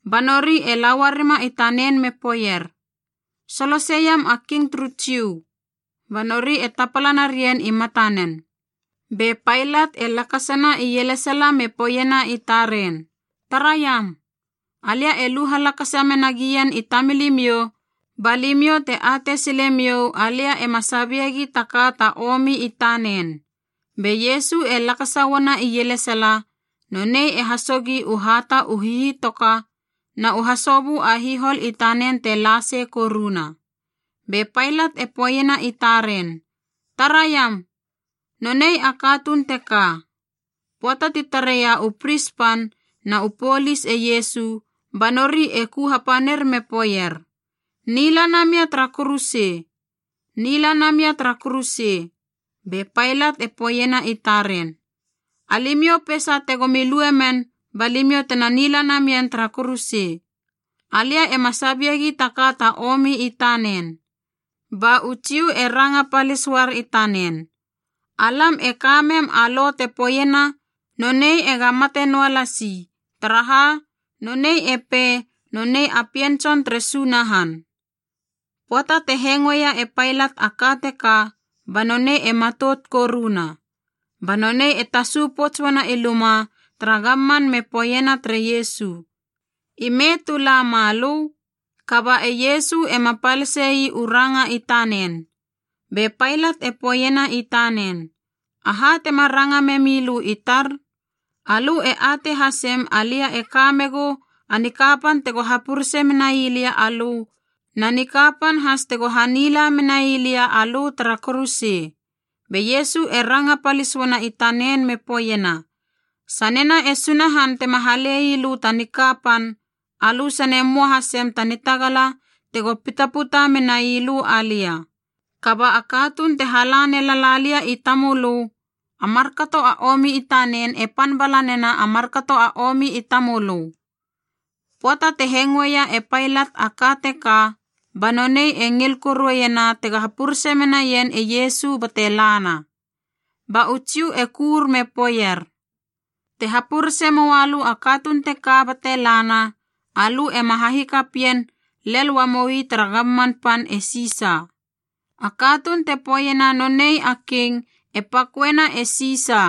Ba nori e la uarima i tanen me poeier, “Soloseiam a King turu Jiu,” ba nori e tapala narien i matanen. Be Pailat e lakasana ielesala me poeiena i taren, “Taraiam! Alia e lu halakasa mena gien i tamilimiou ba limiou te atei silemiou alia ema sabiegi ta ka ta omi i tanen.” Be Iesu e lakasa uana ielesala, nonei e hasogi u hata u hihitoka na u hasobö a hihol i tanen te la sei koruna. Be Pailat e poeiena i taren, “Taraiam! Nonei a katuun teka!” Pöata ti tareia u pris pan na u polis e Iesu ba nori e ku hapanir me poeier, “Nila namia tara kuruse! Nila namia tara kuruse!” Be Pailat e poeiena i taren, “Alimiou peisa tegomi lue men ba limiou tena nila namien tara kuruse. Alia ema sabiegi taka ta omi i tanen.” Ba u Jiu e ranga palis uar i tanen, “Alam e ka mem a lo te poeiena nonei ega mate noua lasi, taraha nonei e pei nonei a Pien Tson tere Sunahan.” Pöata te hengoeia e Pailat a ka teka, ba nonei e matout koruna. Ba nonei e tasu pouts uana i luma tara gamman me poeiena tere Iesu, “Ime tu la malö?” Kaba e Iesu ema palise ii u ranga i tanen. Be Pailat e poeiena i tanen, “Aha tema ranga memi lö i tar? Alö e atei hasem alia e ka megu a nikapan tego hapurese menai lia alö na nikapan has tego hanila menai lia alö tara kuruse.” Be Iesu e ranga palis uana i tanen me poeiena, “Sanena e Sunahan tema halei lö ta nikapan, alö sane möa hasem ta nitagala tego pitaputa menai lö alia. Kaba a katuun te hala nelala lia i limamölö, a markato a omi i tanen e pan bala nena a markato a omi i tamölö.” Pöata te hengoeia e Pailat a ka teka ba nonei e ngil korueiena tega hapurese menaien e Iesu bate lana. Ba u Jiu e kur me poeier, “Te hapurese moua lö a katuun teka bate lana, alö ema hahikapien lel uamoi tara gamman pan e Sisa! A katuun te poeiena nonei a king e paköena e Sisa.”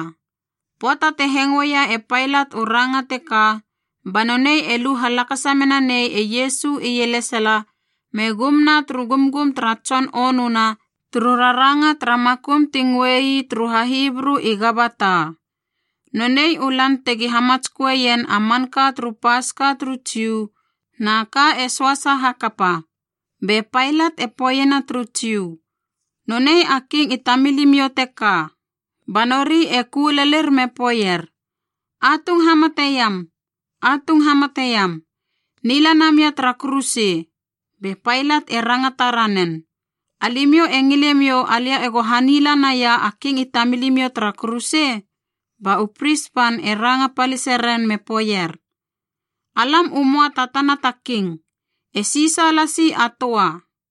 Pöata te hengoeia e Pailat u ranga teka banonei e lu halakasa mena nei e Iesu ielesala me gumna turu gumgum tara tson onuna turu raranga tara makum ti ngöei turu HaHibru i Gabata. Nonei u lan tegi hamatsköeien a manka turu Paska turu Jiu na ka e söasa hakapa. Be Pailat e poeiena turu Jiu, “Nonei a king i tamilimiou teka!” Ba nori e ku lelir me poeier, “Atung hamateiam! Atung hamateiam! Nila namia tara kuruse!” Be Pailat e rangata ranen, “Alimiou e ngilemiou alia ego hanila naia a king i tamilimiou tara kuruse?” Ba u pris pan e ranga palise ren me poeier, “Alam u möa ta tana ta king. E Sisa lasi a töa!”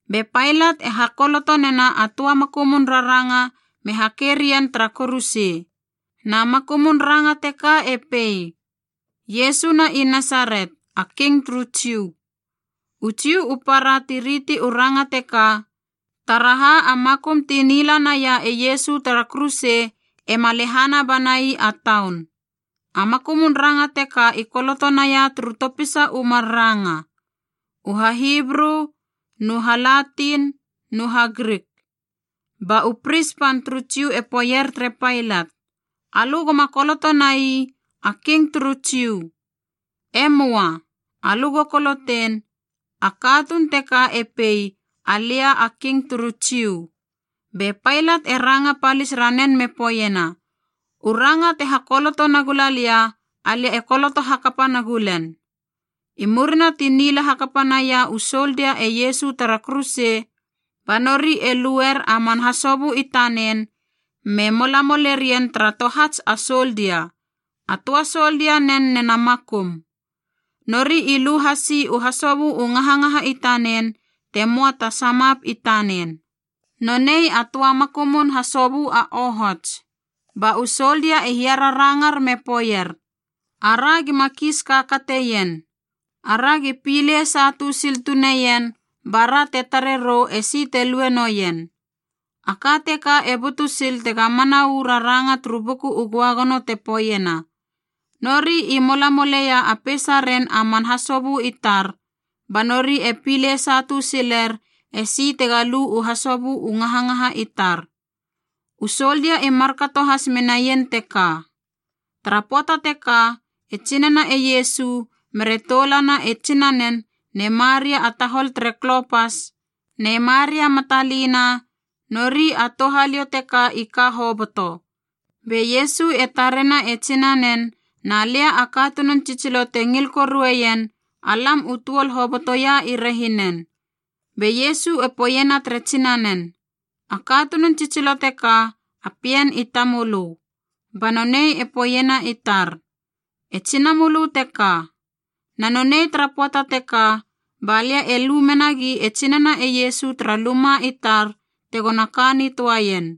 Be Pailat e hakoloto nena a töa makumun raranga me hake rien tara kuruse. Na makumun ranga teka e pei: Iesu na i Nasaret, a King turu Jiu. U Jiu u para ti riti u ranga teka, taraha a makum ti nila naia e Iesu tara kuruse ema lehana banai a taun. A makumun ranga teka i koloto naia turu topisa u mar ranga: U HaHibru nu HaLatin nu HaGrik. Ba u pris pan turu Jiu e poeier tere Pailat, “Alö goma koloto nai: ‘A King turu Jiu.’ E möa. Alö go kolotein: ‘A katuun teka e pei, Alia a King turu Jiu.’” Be Pailat e ranga palis ranen me poeiena, “U ranga te hakoloto nagula lia, alia e koloto hakapa nagulen.” I murina ti nila hakapa naia u soldia e Iesu tara kuruse, ba nori e luer a man hasobö i tanen me molamolerien tara tohats a soldia, a töa soldia nen nena makum. Nori i lu hasi u hasobö u ngahangaha i tanen te möa ta samap i tanen. Nonei a töa makumun hasobö a ohots. Ba u soldia e hiararangar me poeier, “Aragi ma kiis kakateien. Aragi pilei satu sil tuneien bara te tare rou esi te lue noien.” A ka teka e butu sil tega mana uu raranga turu Buku u Göagono te poeiena: “Nori i molamoleia a peisaren a man hasobö i tar. Ba nori e pilei satu siler esi tega lu u hasobö u ngahangaha i tar.” U soldia i markato has menaien teka. Tara pöata teka e tsinana e Iesu, mere toulana e tsinanen ne Maria a tahol tere Klopas, ne Maria Matalina, nori a touhaliou teka i ka hoboto. Be Iesu e tarena e tsinanen na lia a katunun tsitsilo te ngil korueien, alam u tuol hobotoia i rehinen. Be Iesu e poeiena tere tsinanen, “A katunun tsitsilo teka, a pien i tamölö.” Ba nonei e poeiena i tar, “E tsinamölö teka.” Na nonei tara pöata teka ba lia e lu menagi e tsinana e Iesu tara luma i tar tegona ka nitöaien.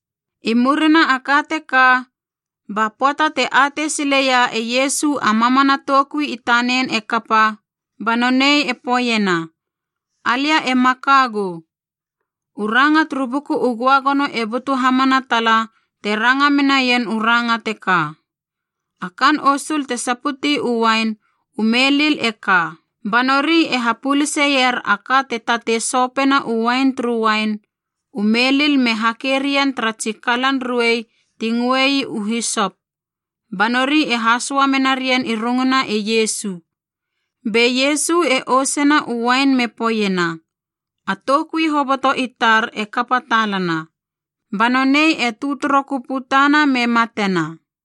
I murina a ka teka, ba pöata te atei sileia e Iesu a mamana toukui i tanen e kapa, ba nonei e poeiena, “Alia e makagu.” U ranga turu Buku u Göagono e butu hamana tala te ranga menaien u ranga teka. A kaan osul te saputi u uain u melil e ka, ba nori e hapöluseier a ka te tatei sopena u uain turu uain u melil me hake rien tara tsi kalan ruei ti ngöei u hisop, ba nori e hasoa menarien i runguna e Iesu. Be Iesu e ousena u uain me poeiena, “A toukui hoboto i tar e kapa talana.” Ba nonei e tötörokö putana me matena.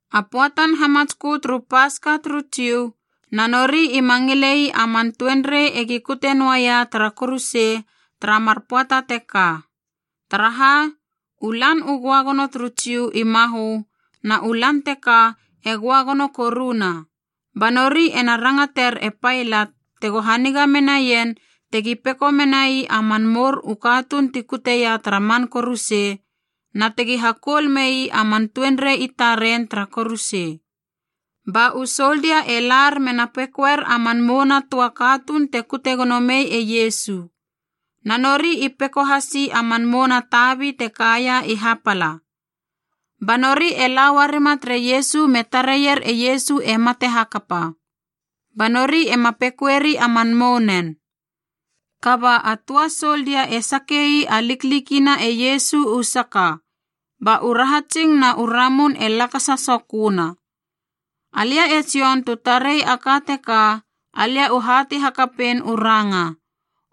A pöatan hamatskö turu Paska turu Jiu, na nori ima ngilei a man tuenrei egi kute noaia tara kuruse tara mar pöata teka. Taraha u lan u Göagono turu Jiu i mahö na u lan teka e Göagono koruna. Ba nori ena rangater e Pailat tego haniga menaien tegi peko menai a man mour u katuun ti kuteia tara man kuruse na tegi hakoul mei a man tuenrei i taren tara kuruse. Ba u soldia e lar mena pekoer a man mouna töa katuun te kute gono mei e Iesu. Na nori i peko hasi a man mouna tabi te kaia i hapala. Ba nori e la uarima tere Iesu me tareier e Iesu e mate hakapa, ba nori ema pekoeri a man mounen. Kaba a töa a soldia e sake ii a liklikina e Iesu u saka. Ba u rahatsing na u ramun e lakasa soköna. Alia e Jon tu tarei a ka teka alia u hatei hakapein u ranga.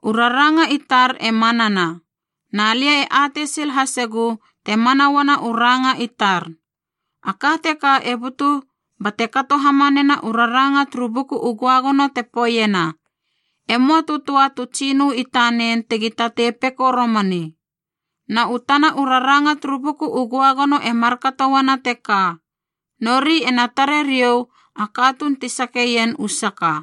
U raranga i tar e manana, na lia e atei sil hasegu te mana uana u ranga i tar. A ka teka e butu bate kato hamanena u raranga turu Buku u Göagono te poeiena, “E möa tu töa tu tsinö i tanen tegi tatei peko romani.” Na u tana u raranga turu Buku u Göagono e markato uana teka, “Nori ena tare riou a katuun ti sakeien u saka.”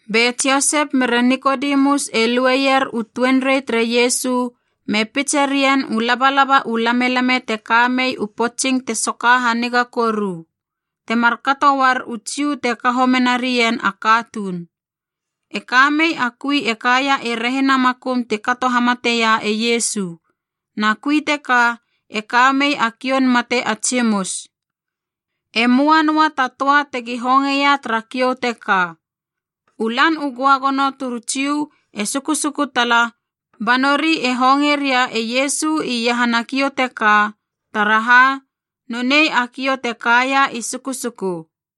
Be Josep mere Nikodemus e lueier u tuenrei tere Iesu me pitse ri ien u labalaba u lamelame te ka mei u potsing te soka haniga koru, temar kato uar u Jiu te kaho mena rien a katuun. E kamei a kui e kaia i rehina makum ti kato hamateia e Iesu, na kui teka e kamei a kioun mate a tsimus. E möa noa ta töa tegi hongeia tara kiou teka. U Lan u Göagono turu Jiu e sukusuku tala, ba nori e honge ria e Iesu iahana kiou teka, taraha nonei a kiou te kaia i sukusuku.